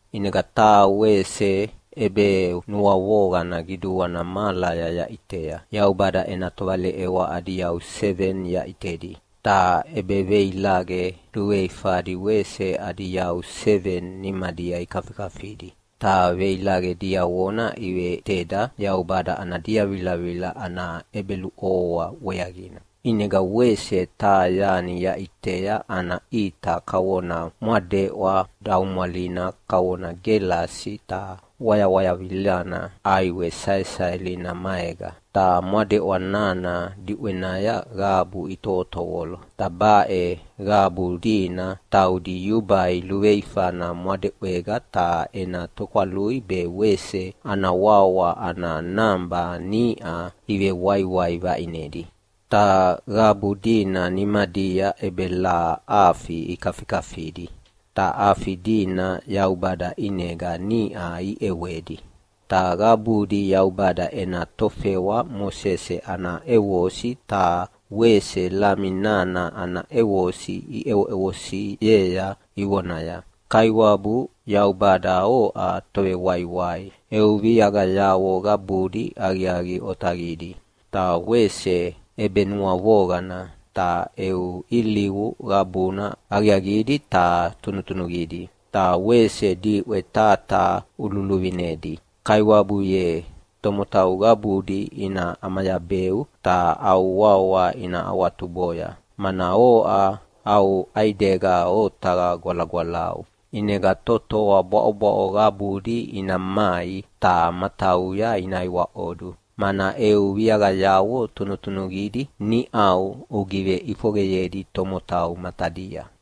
ʼInega taha wese ʼebenuavoqana qiduana mahalaya yaʼitea. Yaubada ena tovaleʼewa adi yau seveni yaʼitedi, ta ʼebeveilaqe luveifadi wese adi yau seveni nimadia ikafikafidi. Ta veilaqe diavona iveveʼiteda Yaubada ana diavilavila ana ʼebeluʼovoa weaqina. ʼInega wese taha yani yaʼitea ana ʼita kavona mwadeʼwa daumwalina kavona gelasi ta wayawayavilana ʼaiwe saesaelina maega. Ta mwadeʼwa nana diʼwenaya qabu itovotovolo, ta baʼe qabu dina taudi yubai luveifana mwadeʼwega ta ena tokwalui be wese ana wawa ana naba niʼa ivewaiwai vaʼinedi. Ta qabu dina nimadia ʼebelaha afi ikafikafidi, ta afi dina Yaubada ʼinega niʼa iʼewedi. Ta qabudi Yaubada ena tofewa Mosese ana ʼevosi ta wese Lami nana ana ʼevosi iʼevosiea ivonaya, “Kaiwabu Yaubada oʼa Tovewaiwai. Eu viaqayavo qabudi aqiaqi otaqidi ta wese ʼebenuavoqana. Ta eu ilivu qabuna aqiaqidi ta tunutunuqidi, ta wese diʼwe taha taha ululuvinedi. Kaiwabu ye, tomotau qabudi ina ʼamayabeu ta au wawa ina awatuboya, mana oʼa au ʼaidega otaqa gwalagwalau. ʼInega totoa bwaʼobwaʼo qabudi ina mai ta matauya ina iwaʼodu, mana eu viaqayavo tunutunuqidi niʼau ugiveʼifoqeyedi tomotau matadia.”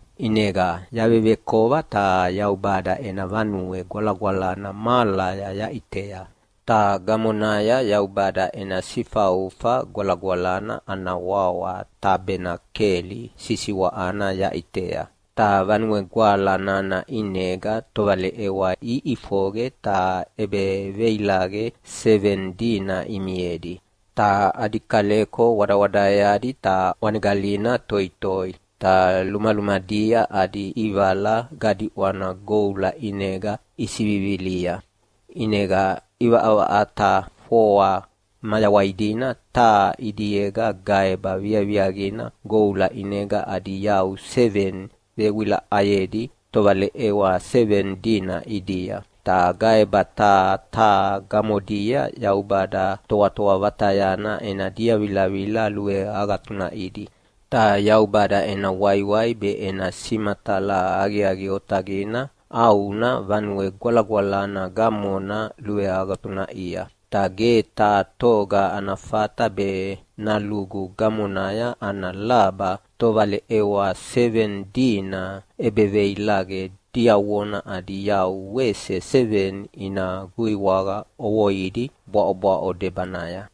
ʼInega yavevekova ta Yaubada ena Vanue Gwalagwalana mahalaya yaʼitea, ta gamonaya Yaubada ena Sifaufa Gwalagwalana ana wawa Tabenakeli sisiwaʼana yaʼitea. Ta Vanue Gwala nana ʼinega tovaleʼewa iʼifoqe ta ʼebeveilaqe seveni dina imiedi. Ta adi kaleko wadawadaeadi ta ʼwanegalina toitoi. Ta lumalumadia adi ʼivala gadiʼwana goula ʼinega isivivilia. ʼInega ʼivaʼavaʼata foa mayawai dina taha ʼidiega gaeba viaviaqina goula ʼinega adi yau seveni vewilaʼayedi tovaleʼewa seveni dina ʼidia, ta gaeba taha taha gamodia Yaubada Toatoa Vatayana ena diavilavila luveagatunaʼidi. Ta Yaubada ena waiwai be ena simatala aqiaqi otaqina ʼauna Vanue Gwalagwalana gamona luveagatunaʼia. Ta ge taha toga ana fata be nalugu gamonaya ana laba tovaleʼewa seveni dina ʼebeveilaqe diavona adi yau wese seveni ina guiwaqa ʼovoidi bwaʼobwaʼo debanaya.